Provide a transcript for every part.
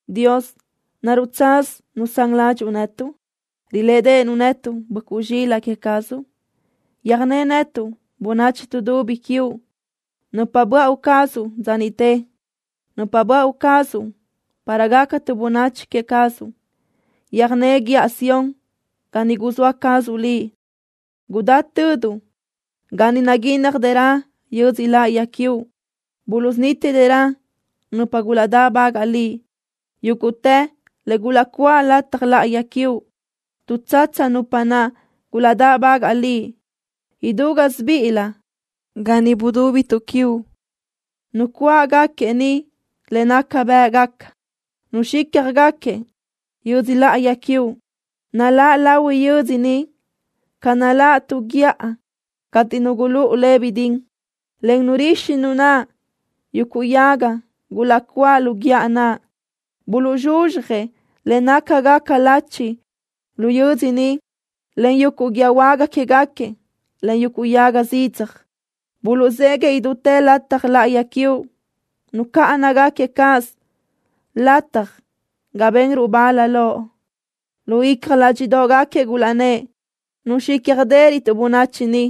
Dios, ¿naruʼ tsaz nusán ládxuʼu netuʼ? ¿Rilédeʼenuʼ netuʼ, böʼcuʼ zxilaʼ queë cazuʼ? Yöjné netuʼ, bönachi tuʼdubi quiuʼ, nupa böáʼu cazuʼ dza niʼte, nupa böáʼu cazuʼ para gácatuʼ bönachi queë cazuʼ. Yöjné guíʼa Sión, ga ni guzóa cazuʼ Liʼ. Gudá töduʼ ga ni naguínnajdërö yödzö láʼayi quiuʼ. Buluʼsunítidërö nupa gulaʼdáʼbagaʼ Liʼ yúguʼtë le gulaʼcuáʼ lataj láʼayi quiuʼ. Tuʼtsatsa nupa naʼ gulaʼdáʼbagaʼ Liʼ idú gásibiʼilö ga ni budúbituʼ quiuʼ. Nucuáʼgaquiëʼ ni le naca bë́ʼgaca nuxícjagaquiëʼ yödzö láʼayi quiuʼ. Naláʼ lahui yödzö ni ca naláʼ tu guíʼa cateʼ nu gulúʼu le bidín, en nurixi nu naʼ yuguʼ yaga gulaʼcuáʼ lu guíʼa naʼ. Buluʼzxuzxjëʼ le nácagaca lachi lu yödzö ni len yuguʼ guíë huága quégaquiëʼ, en yuguʼ yaga zidzaj. Buluʼzéguiʼë idútë lataj láʼayi quiuʼ. Nucáʼanagaquiëʼ cáʼasö lataj ga benruʼ bal Loʼ. Lu icja ládxiʼdoʼgaquiëʼ gulaʼnë́ʼ: “Nuxícjadërötuʼ bönachi ni.”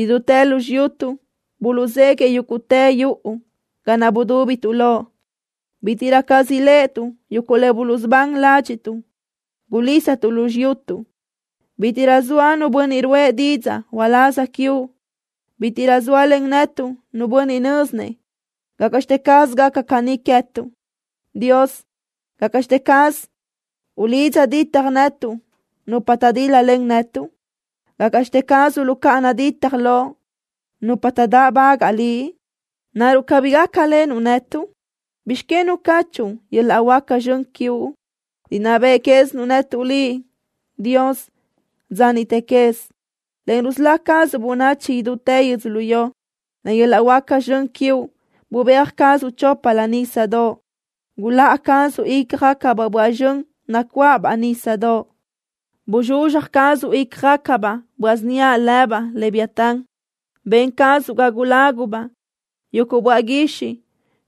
Idútë lu xiyutuʼ buluʼzéguiʼë yúguʼtë yuʼu ga naʼ budúbituʼ loʼ. Bítiʼrö caz riléʼetuʼ yuguʼ le buluʼsubán ládxiʼtuʼ gulísatuʼ lu xiyutuʼ. Bítiʼrö zoa nu bönniʼ ruʼë didzaʼ uláz quiuʼ. Bítiʼrö zóalen netuʼ nu bönniʼ nö́zinëʼ gácaʼxte caz gaca caní queë́tuʼ. Dios, ¿gácaʼxte caz uluʼlidza ditaj netuʼ nupa taʼdíl-lalen netuʼ? ¿Gácaʼxte caz uluʼcáʼana ditaj Loʼ nupa taʼdáʼbagaʼ Liʼ? ¿Naruʼ cabí gácalenuʼ netuʼ? ¿Bizx que nucáchuʼu yöl-laʼ huáca zxön quiuʼ? Rinná beʼe quézinuʼ netuʼ Liʼ, Dios, dza niʼte quez, en rusölá cazuʼ bönachi idútë yödzölió. Len yöl-laʼ huáca zxön quiuʼ bubéaj cazuʼ choplö nísadoʼ. Guláʼa cazuʼ ícjagacabaʼ böaʼ zxön nacuáʼabaʼ nísadoʼ. Bzxuzxja cazuʼ ícjagacabaʼ böaʼ síniaʼ lëbaʼ Leviatán. Ben cazuʼ ga gulágubaʼ yuguʼ böaʼ guixiʼ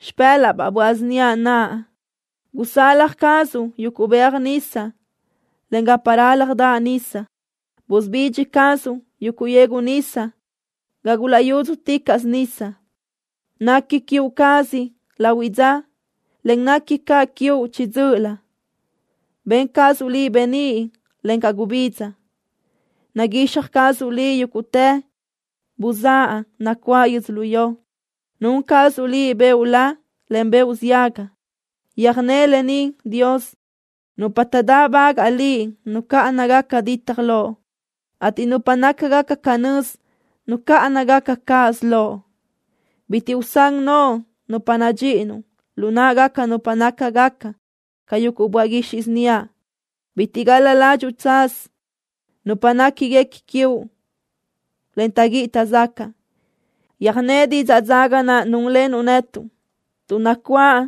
xipë́laʼbaʼ böaʼ síniaʼ naʼ. Gusalaj cazuʼ yuguʼ beaj nisa, en gapa rálajdaʼ nisa. Busubidxi cazuʼ yuguʼ yegu nisa gulaʼyúdzuticaʼsö nisa. Nequi queë cazuʼ lahuiʼ dza, en nequi caʼ quiuʼ chiʼi dzö́ʼölö. Ben cazuʼ Liʼ beníʼ, encaʼ gubidza. Naguixaj cazuʼ Liʼ yúguʼtë buzáʼ nacuáʼ yödzölió. Nun cazuʼ Liʼ beoʼ la, en beoʼ ziaga. Yöjné lë ni, Dios. Nupa taʼdáʼbagaʼ Liʼ nucáʼanagaca ditaj Loʼ, ateʼ nupa nácagaca canö́z nucáʼanagaca cáʼasö Loʼ. Bitiʼ usán noʼo nupa nadxíʼinuʼ lu náʼagaca nupa nácagaca ca yuguʼ böaʼ guixiʼ síniaʼ. Bitiʼ gal-la ládxuʼu tsaz nupa néquiguequi quiuʼ, en taʼguíʼi taʼzacaʼ. Yöjné didzaʼ dzaga naʼ núnlenuʼ netuʼ, tuʼ nacuáʼ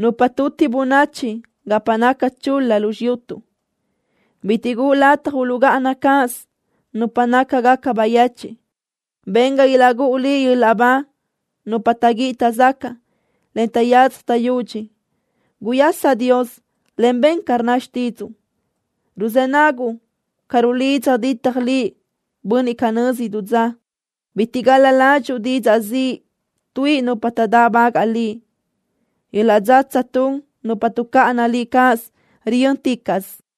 nupa tuti bönachi gapa naca chul-la lu xiyutuʼ. Bitiʼ guʼu lataj uluʼgáʼana cáʼasö nupa nácagaca bayechiʼ. Ben ga ilaʼgúʼu Liʼ yöl-laʼ ba nupa taʼguíʼi taʼzacaʼ, en taʼyadzaj taʼyudxi. ¡Guyasa, Dios, en ben ca rnna xtídzuʼu! ¡Ruzë́ naguʼ ca rulidza ditjëʼ Liʼ bönniʼ canö́z idú dza! Bitiʼ gal-la ládxuʼu didzaʼ ziʼ tuíʼi nupa taʼdáʼbagaʼ Liʼ. Yöl-laʼ dzatsa tun nupa tuʼcáʼana Liʼ cáʼasö riyö́nticaʼsö.